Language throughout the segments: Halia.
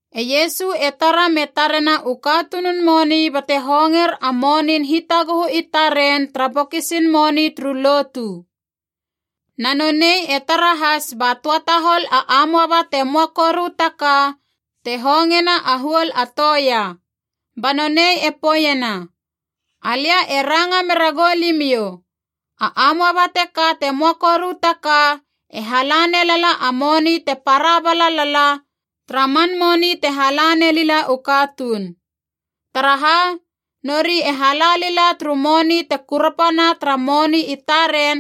E Iesu e tara me tarena u katunun moni bate honger a monin hitaguhu i taren tara bokisin moni turu lotu. Na nonei e tara has ba töa tahol a amoaba te möa koru ta ka te hongena a huol a toea. Ba nonei e poeiena, “Alia e ranga mera goulimiou, a amoaba teka te möa koru ta ka e hala nelala a moni te para bala lala tara man moni te hala nelila u katuun. Taraha? Nori e hala lila turu moni te kurapana tara moni i taren,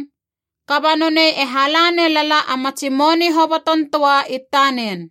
kaba nonei e hala nelala a matsi moni hoboton töa i tanen.”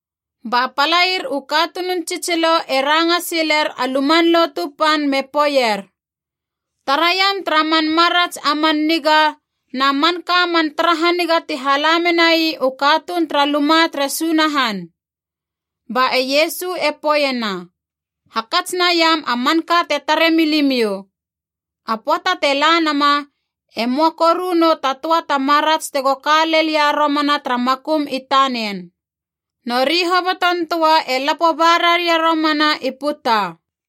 Ba palair u katunun tsitsilo e ranga siler a Luman Lotu Pan me poeier, “Taraiam tara man marats a man niga na manka man tara haniga ti hala menai u katuun tara luma tere Sunahan!” Ba e Iesu e poeiena, “Hakats naiam a manka te tare milimiou. A pöata te la nama e möa koru nou ta töa ta marats tego ka lelia romana tara makum i tanen. Nori hoboton töa e lapo ba raria romana i puta.”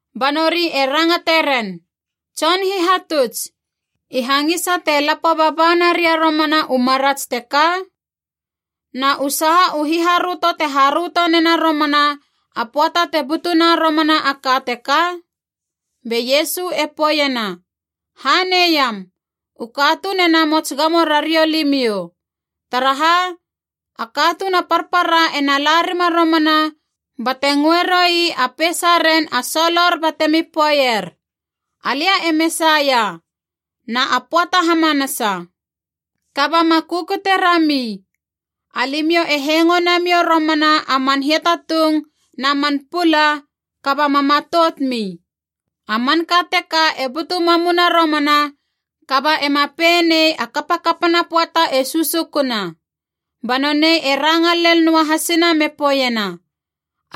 Ba nori e rangate ren, “Tson Hihatuts, i hangisa te lapo baba naria romana u marats teka? Na u saha u hiharöto te haröto nena romana a pöata te butuna romana a ka teka?” Be Iesu e poeiena, “Hanei iam, u katuun e namots gamo rariou limiou. Taraha? A katuun a parpara ena la rima romana bate ngöe roui a peisaren a solor batemi poeier, ‘Alia e Mesaia,’ na ‘A pöata hamanasa!’ Kaba ma kukute rami. Alimiou e hengo namiou romana a man hiatatung na man pula, kaba ma matoutmi. A manka teka e butu mamuna romana, kaba ema pei nei a kapakapana pöata e susukuna.” Ba nonei e ranga lel noa hasina me poeiena,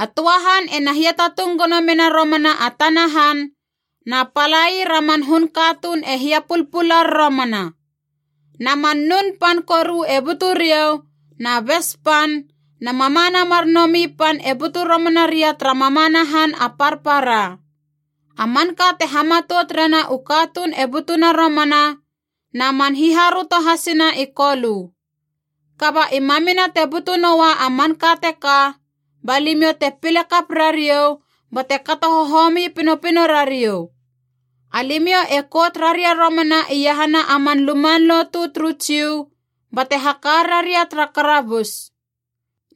“A töa han ena hiatatung gono mena romana a tana han, na palair a man hun katuun e hiapulpular romana. Na man nun pan koru e butu riou, na bes pan na mamana mar nomi pan e butu romana ria tara mamana han a parpara. A manka te hamatout rena u katuun e butuna romana, na man hiharöto hasina i kolö. Kaba i mamina te butu noua a manka teka, ba limiou te pile kap rariou bate kato hohomi pinopino rariou. Alimiou e kout raria romana iahana a man luman lotu turu Jiu bate haka raria tara karabus.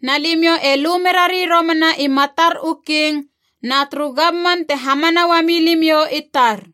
Na limiou e lu merari romana i matar u king na turu gamman te hamana uami limiou i tar.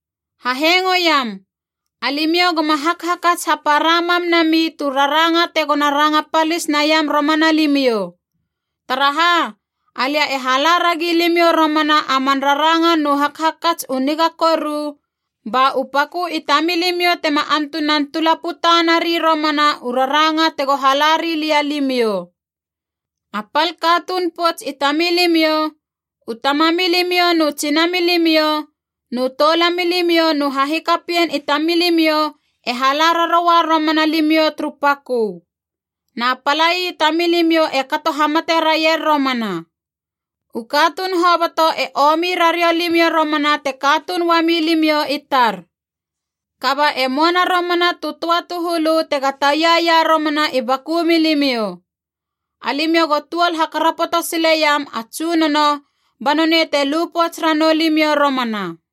Hahengoiam! Alimiou goma hakhakats hapara mam nami tu raranga tegona ranga palis naiam romana limiou. Taraha? Alia e hala ragi limiou romana a man raranga nu hakhakats u niga koru, ba u pakö i tamilimiou tema antunan tulaputa nari romana u raranga tego hala rilia limiou. A pal katuun pouts i tamilimiou, u tamamilimiou nu tsinamilimiou nu toulamilimiou nu hahikapien i tamilimiou e hala raroua romana limiou turu pakö. Na palai i tamilimiou e kato hamate raier romana. U katuun hoboto e omi rariou limiou romana te katuun uami limiou i tar. Kaba e möana romana tu töa tu hulu tega taia ia romana i baku milimiou. Alimiou go tuol hakarapoto sile iam a Tsunono ba nonei te lu pouts ranou limiou romana.”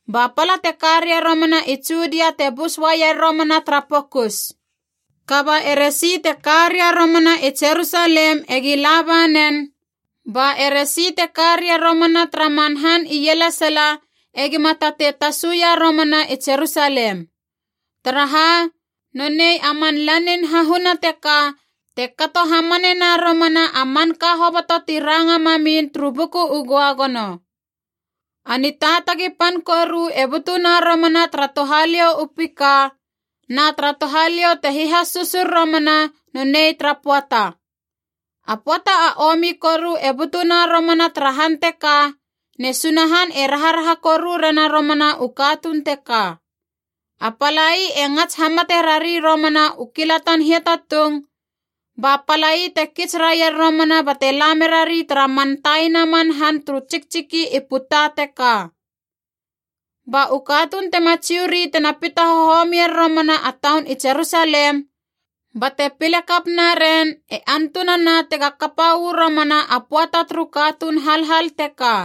Ba pala te ka ria romana i Judia te bus uaier romana tara pokus. Kaba eresi te ka ria romana i Jerusalem egi laba nen, ba e resi te ka ria romana tara man han ielesala egima tatei tasuia romana i Jerusalem. Taraha? Nonei a man lanin hahuna teka te kato hamanena romana a manka hoboto ti ranga mamin turu Buku u Göagono. A nitaatagi pan koru e butuna romana tara touhaliou u pika, na tara touhaliou te hihasusur romana nonei tara pöata. A pöata a omi koru e butuna romana tara han teka, ne Sunahan e raharaha koru rena romana u katuun teka. A palai e ngats hamate rari romana u kilatan hiatatung, ba palai te kits raier romana bate la merari tara man taina man han turu tsiktsiki i puta teka. Ba u katuun tema Jiu ri tena pita hohomier romana a taun i Jerusalem bate pile kap naren e antunana tega kapa uu romana a pöata turu katuun halhal teka.”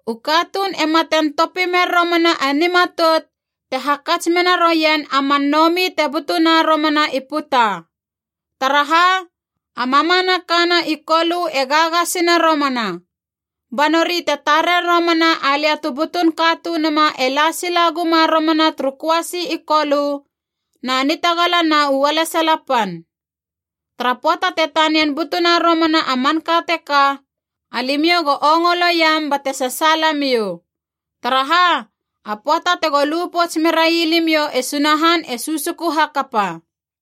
U katuun e maten topi mer romana a nimatout te hakats mena rouien a man nomi te butuna romana i puta. Taraha? A mamanaka na i kolö e gagasina romana. Ba nori te tarer romana alia tu butun Katunuma e la sila guma romana turu köasi i kolö na nitagala na u ualesala pan. Tara pöata te tanian butuna romana a manka teka, alimiou go ongoloiam bate sasaala miou. Taraha? A pöata tego lu pouts merai limiou e Sunahan e susuku hakapa!”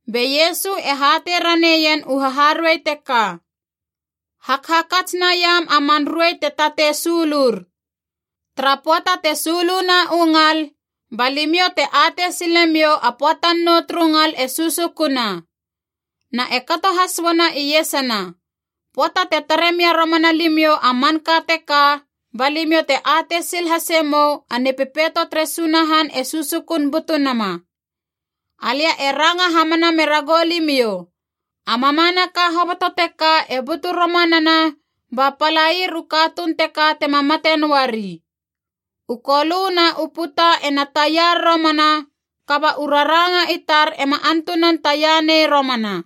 Be Iesu e hatei raneien u haharuei teka, “Hakhakats naiam a man ruei te tatei sulur. Tara pöata te suluna u ngal, ba limiou te atei sile miou a pöatan nou turu ngal e susukuna. Na e kato has uana iesana, pöata te tare mia romana limiou a manka teka, ba limiou te atei sil hase mou a Nipepeito tere Sunahan e susukun butu nama. Alia e ranga hamana mera goulimiou, a mamanaka hoboto teka e butu romanana ba palair u katuun teka tema mate noari. U kolö na u puta ena taiar romana, kaba u raranga i tar ema antunan taia nei romana.”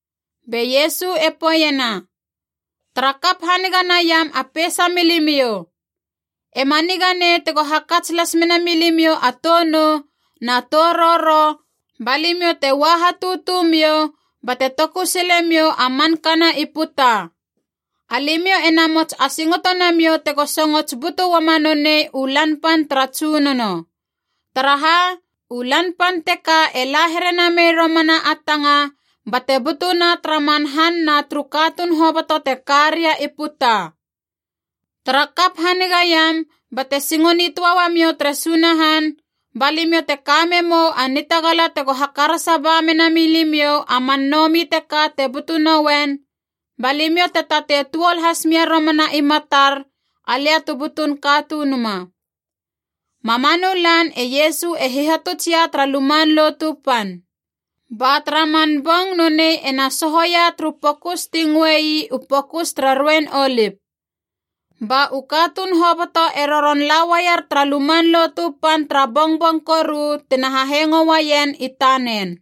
Be Iesu e poeiena, “Tara kap haniga naiam a peisa milimiou! Ema niga nei tego hakats las mena milimiou a tou nou na tou roro ba limiou te ua hatutu miou bate toku sile miou a manka na i puta. Alimiou e namots asingoto namiou tego songots butu uama nonei u Lan Pan tara Tsunono. Taraha? U Lan Pan teka e la here namei romana a tanga bate butuna tara man han na turu katuun hoboto te ka ria i puta. Tara kap hanigaiam bate singo nitöa uamiou tere Sunahan, ba limiou te ka memou a nitagala tego hakarasa ba menami limiou a man nomi teka te butu nouen, ba limiou te tatei tuol has mia romana i matar, alia tu butun Katunuma.” Mamanu lan e Iesu e hihatutsia tara Luman Lotu Pan. Ba tara man bong nonei e na sohoia turu pokus ti ngöei u Pokus tara Ruein Olip. Ba u katuun hoboto e roron la uaier tara Luman Lotu Pan tara bongbong koru tina hahengo uaien i tanen.